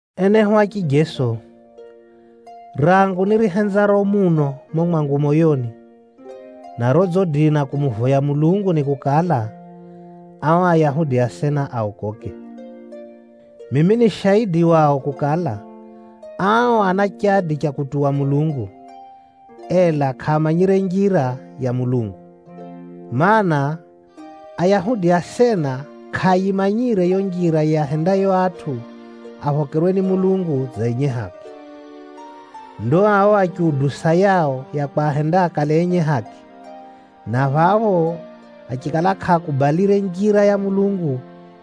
Enehu a chijeso, rangu nirihenzaro muno mumo mwangu moyoni, na rodzidina kumuvoya Mulungu ni kukala, ao Ayahudi asena aokoke. Mimi ni shaidi wao kukala, ao ana chadi cha kutuwa Mulungu, ela kʼaamanyire njira ya Mulungu. Maana, Ayahudi asena kʼaayimanyire yo njira yiahendayo atʼu aphokerwe ni Mulungu dza enye haki. Ndo ao achiudusa yao ya kwahenda akale enye haki, na phapho achikala kʼaakubalire njira ya Mulungu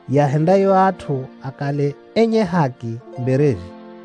yiahendayo atʼu akale enye haki mbereze.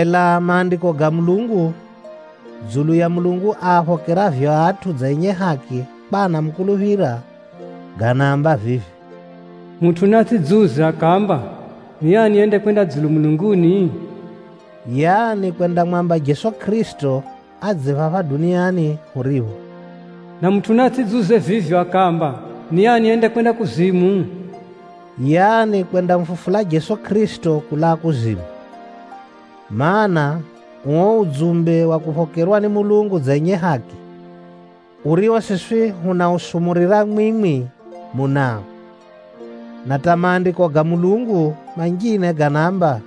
Ela Maandiko ga Mulungu dzulu ya Mulungu aaphokeravyo atʼu dza enye haki kwa anamukuluphira, ganaamba vivi, “Mutʼu naatsʼidziuze mwakwe moyoni akaamba, ‘Ni ani yendakwenda dzulu mulunguni?’” (Yaani kwendamwamba Jeso Kʼirisito adze phapha duniani huripho). “Na mutʼu naatsʼidziuze vivyo akaamba, ‘Ni ani yendakwenda kuzimu?’” (Yaani kwendamufufula Jeso Kʼirisito kulaa kuzimu). Maana, uo udzumbe wa kuphokerwa ni Mulungu dza enye haki, urio siswi hunausumurira, mwimwi munao. Na hata Maandiko ga Mulungu manjine ganaamba,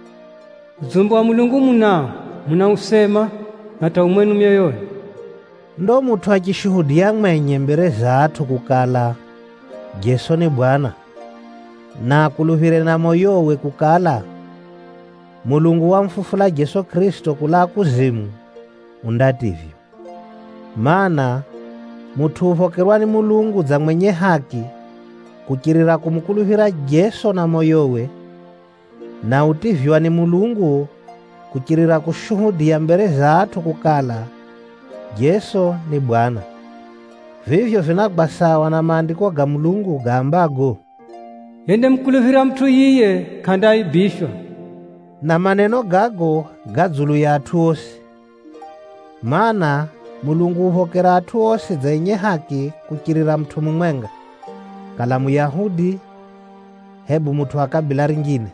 “Neno ri phephi namwi, ri mwenu milomoni na ri mwenu myoyoni.” Ndo mutʼu achishuhudiya mwenye mbere za atʼu kukala, Jeso ni Bwana, na akuluphire na moyowe kukala, Mulungu wamufufula Jeso Kʼirisito kulaa kuzimu, undativywa. Maana, mutʼu uphokerwa ni Mulungu dza mwenye haki kuchirira kumukuluphira Jeso na moyowe, na utivywa ni Mulungu kuchirira kushuhudiya mbere za atʼu kukala, Jeso ni Bwana. Vivyo vinagwa sawa na Maandiko ga Mulungu gaambago, “Yendamukuluphira mutʼu yiye, kʼandaifyika.” Na maneno gago ga dzulu ya atʼu osi, mana, Mulungu uphokera atʼu osi dza enye haki kuchirira mutʼu mumwenga, kala Muyahudi, hebu mutʼu wa kabila rinjine.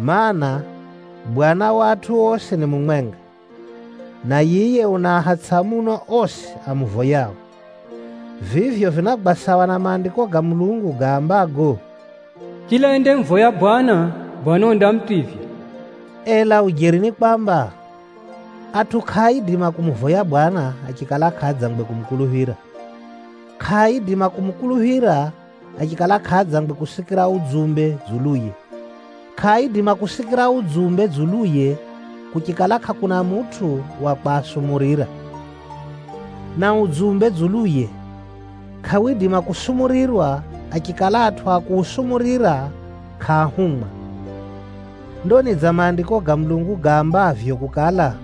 Maana, Bwana wa atʼu osi ni mumwenga, na yiye unaahatsʼa muno osi amuvoyao. Vivyo vinagwa sawa na Maandiko ga Mulungu gaambago, “Chila yendariiha dzina ra Bwana Mulungu, undativywa.” Ela ujeri ni kwamba, atʼu kʼaaidima kumuvoya Bwana achikala kʼaadzangwe kumukuluphira. Kʼaaidima kumukuluphira achikala kʼaadzangwe kusikira udzumbe dzuluye. Kʼaaidima kusikira udzumbe dzuluye kuchikala kʼakuna mutʼu wa kwasumurira. Na udzumbe dzuluye, kʼawidima kusumurirwa achikala atʼu a kuusumurira kʼaahumwa. Ndo ni dza Maandiko ga Mulungu gaambavyo kukala,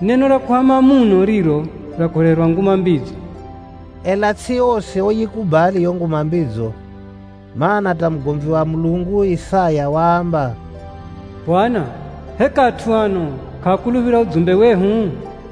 “Ni neno ra kuhama muno riro ra kureherwa Nguma Mbidzo.” Ela tsʼi osi oyikubali yo Nguma Mbidzo, mana, hata mugomvi wa Mulungu Isaya waamba, “Mwenyezi Mulungu, ni ani yekuluphira udzumbe wehu?”